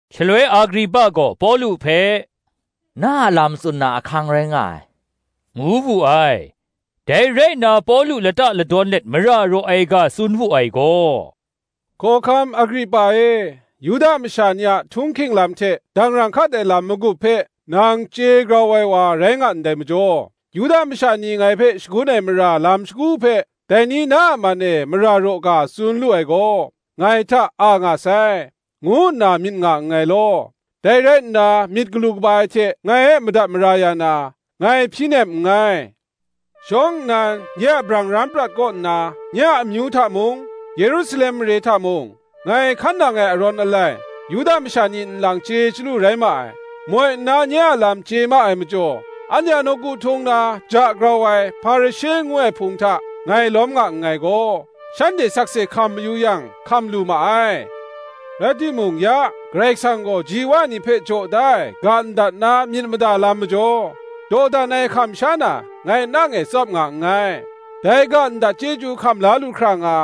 Shaloi Agripa gaw Pawlu hpe, “Na a lam tsun na ahkang rai nga ai,” ngu wu ai. Dai rai nna Pawlu lata ladawn let mara raw ai ga tsun wu ai gaw: “Hkawhkam Agripa e, Yuda masha ni a htung hking lam hte dangrang hkat ai lam magup hpe nang chye grau ai wa rai nga ndai majaw; Yuda masha ni ngai hpe shagun ai mara lam shagu hpe, dai ni na a man e mara raw ga tsun lu ai gaw, ngai hta a nga sai, ngu nna myit nga nngai law: dai rai nna, myit galu kaba ai hte ngai e madat mara ya na, ngai hpyi nem nngai. Shawng nnan, nye a brang ram prat kaw nna, nye a amyu hta mung, Yerusalem mare hta mung, ngai hkan nang ai arawn alai, Yuda masha ni nlang chye chyalu rai ma ai. Moi nna nye a lam chye ma ai majaw, anhte a nawku htung na ja grau ai Hparishe ngu ai hpung hta ngai lawm nga nngai gaw, shanhte sakse hkam mayu yang, hkam lu ma ai. Rai timung, ya, Karai Kasang gaw ji wa ni hpe jaw da ai ga ndat na myit mada lam majaw, dawdan ai hkam sha na, ngai nang e tsap nga nngai: dai ga ndat chyeju hkam la lu hkra nga,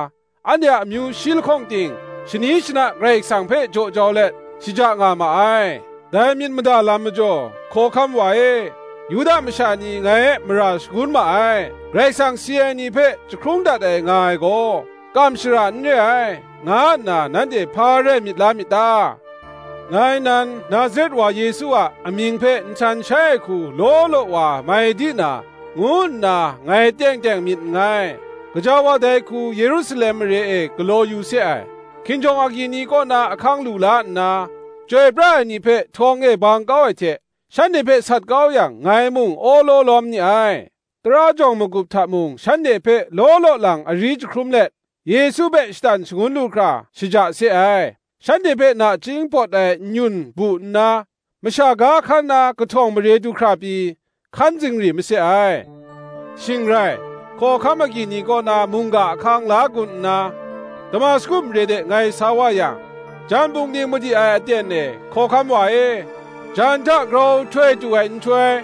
anhte a amyu shi lahkawng ting, shani shana Karai Kasang hpe jaw jau let, shaja nga ma ai: dai myit mada lam majaw, Hkawhkam wa e, Yuda masha ni ngai e mara shagun ma ai. Karai Kasang si ai ni hpe jahkrung dat ai nga ai gaw, kam shara n re ai, nga nna nanhte hpa rai myit la myit ta? Ngai nan, Nazaret wa Yesu a amying hpe nhtan shai ai hku law law wa mai di na, ngu nna ngai teng teng myit nngai. Gaja wa dai hku Yerusalem mare e galaw yu se ai, hkinjawng agyi ni kaw na ahkang lu la nna, chyoi pra ai ni hpe htawng e bang kau ai hte, shanhte hpe sat kau yang, ngai mung awlaw lawm ni ai. Tara jawng magup hta mung shanhte hpe law law lang ari jahkrum let, Yesu hpe shatan shangun lu hkra shaja se ai: shanhte hpe nachying pawt ai n-yun, bu nna, masha ga hkan na kahtawng mare du hkra pyi, hkan zingri mase ai. Shing rai, hkinjawng agyi ni kaw na mungga ahkang la gun nna, Damasku mare de ngai sa wa yang, Jan pungding madi ai aten e, Hkawhkam wa e, jan hta grau htoi tu ai nhtoi,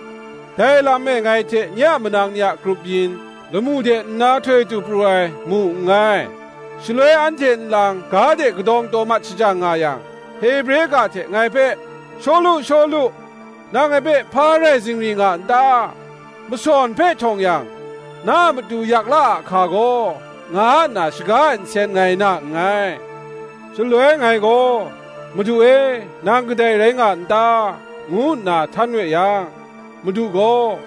dai lam e ngai hte nye a manang ni a grup yin, lamu de nna htoi tu pru ai, mu nngai. Shaloi anhte nlang ga de kadawng taw mat shajang nga yang, Hebre ga hte ngai hpe, ‘Shawlu, Shawlu nang ngai hpe hpa rai zingri nga n ta? masawn hpe htawng yang, na matu yak la ahka gaw,’ nga nna shaga ai nsen ngai na nngai. Shaloi ngai gaw, ‘Madu e, nang kadai rai nga n ta?’ ngu nna htan we yang, Madu gaw,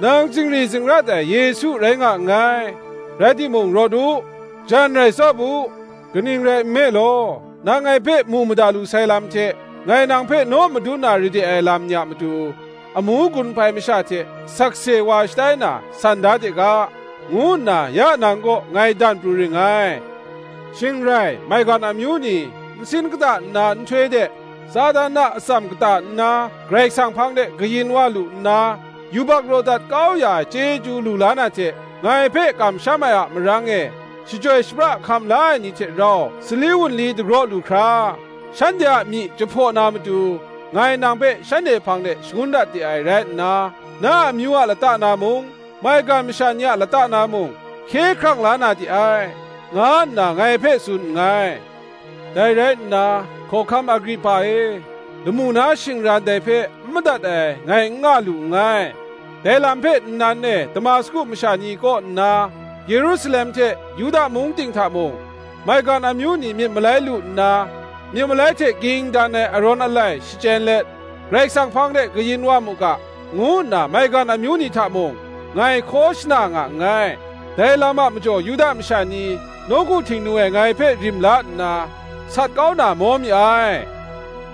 ‘Nang zingri zingrat ai Yesu rai nga nngai. Rai timung, rawt u, jan rai tsap u: kaning rai nme law, nang ngai hpe mu mada lu sai lam hte, ngai nang hpe naw madun na ra de ai lam ni a matu, amu gun hpai masha hte sakse wa shatai na san da de ga, ngu nna ya nang kaw ngai dan pru ring ngai: shing rai maigan amyu ni, nsin kata nna nhtoi de, Satan a atsam kata nna Karai Kasang hpang de kayin wa lu nna, yubak raw dat kau ya ai chyeju lu la na hte, ngai hpe kamsham ai a marang e, shachyoi shapra hkam la ai ni hte rau Sali wunli dagraw lu hkra, shanhte a myi jahpaw na matu, ngai nang hpe shanhte hpang de shangun dat de ai rai nna, na a amyu a lata na mung, maigan masha ni a lata na mung, hkye hkrang la na de ai,’ nga nna ngai hpe tsun nngai. Dai rai nna, Hkawhkam Agripa e, lamu na shingran dai hpe n madat ai, ngai n nga lu nngai: dai lam hpe nnan e Damasku masha ni kaw nna, Yerusalem hte Yuda mung ting hta mung, maigan amyu ni myit malai lu nna, myit malai hte ging dan ai arawn alai shachyen let, Karai Kasang hpang de kayin wa mu ga, ngu nna maigan amyu ni hta mung, ngai hkaw shana nga nngai. Dai lam a majaw Yuda masha ni, nawku Htingnu e ngai hpe rim la nna, sat kau na maw mi ai.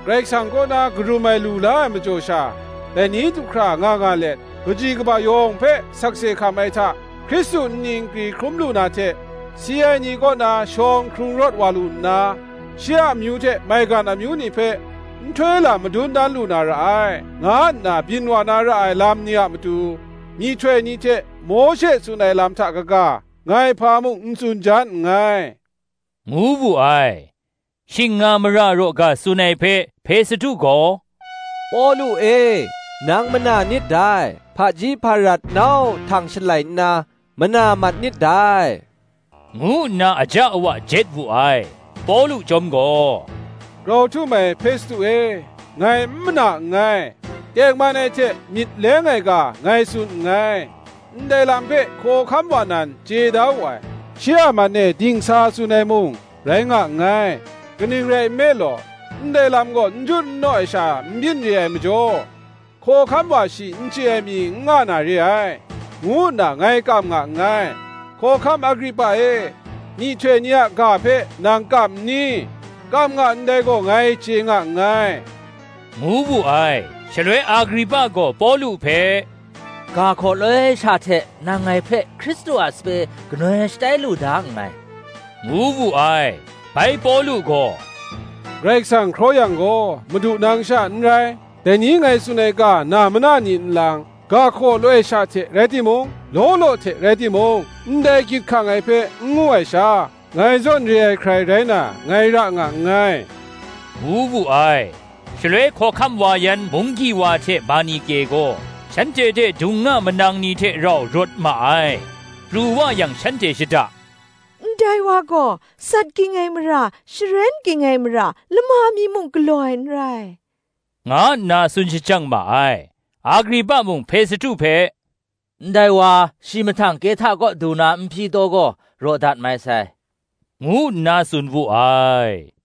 Karai Kasang kaw na karum ai lu la ai majaw sha, dai ni du hkra nga nga let, kaji kaba yawng hpe sakse hkam ai hta, Hkristu nni nkri hkrum lu na hte, si ai ni kaw na shawng hkrung rawt wa lu nna, shi a amyu hte maigan amyu ni hpe nhtoi lam madun dan lu na ra ai, nga nna byin wa na ra ai lam ni a matu, myihtoi ni hte Mawshe tsun ai lam hta kaga, ngai hpa mung n tsun jan nngai,” ngu wu ai. Shing nga mara raw ga tsun ai hpe, Hpestu gaw, “Pawlu e, nang mana nit dai; hpaji hparat nau htang shalai nna mana mat nit dai,” ngu nna aja awa jet wu ai. Pawlu Chyawm gaw, “Grau htum ai Hpestu e, ngai n mana nngai; tengman ai hte myit leng ai ga ngai tsun nngai. Ndai lam hpe Hkawhkam wa nan chye da wu ai; shi a man e dingsa tsun ai mung, rai nga nngai: kaning rai nme law, ndai lam gaw njut nnaw e sha n byin re ai majaw, hkawhkam wa shi n chye ai mi n nga na re ai, ngu nna ngai kam nga nngai. Hkawhkam Agripa e, myihtoi ni a ga hpe nang kam n ni? kam nga ndai gaw ngai chye nga nngai,” ngu wu ai. Shaloi Agripa gaw Pawlu hpe, “Ga hkaw loi sha hte nang ngai hpe Hkristu a sape ganoi shatai lu da nngai,” ngu wu ai. Bai Pawlu gaw, “Karai Kasang hkraw yang gaw, madu nang sha n rai, dai ni ngai tsun ai ga na mana ni nlang, ga hkaw loi sha hte rai timung, law law hte rai timung, ndai gyit hkang ai hpe n ngu ai sha, ngai zawn re ai hkrai rai na, ngai ra nga nngai,” ngu wu ai. Shaloi hkawhkam wa yan munggyi wa hte Bernike gaw, shanhte hte dung nga manang ni hte rau rawt ma ai. Pru wa yang shanhte shada, “Ndai wa gaw sat ging ai mara, sharen ging ai mara, lama mi muk galaw ai n rai,” nga nna tsun shajang ma ai. Agripa mung Hpestu hpe, “Ndai wa shi mahtang Kehta kaw du na n hpyi taw gaw, raw dat mai sai,” ngu nna tsun wu ai.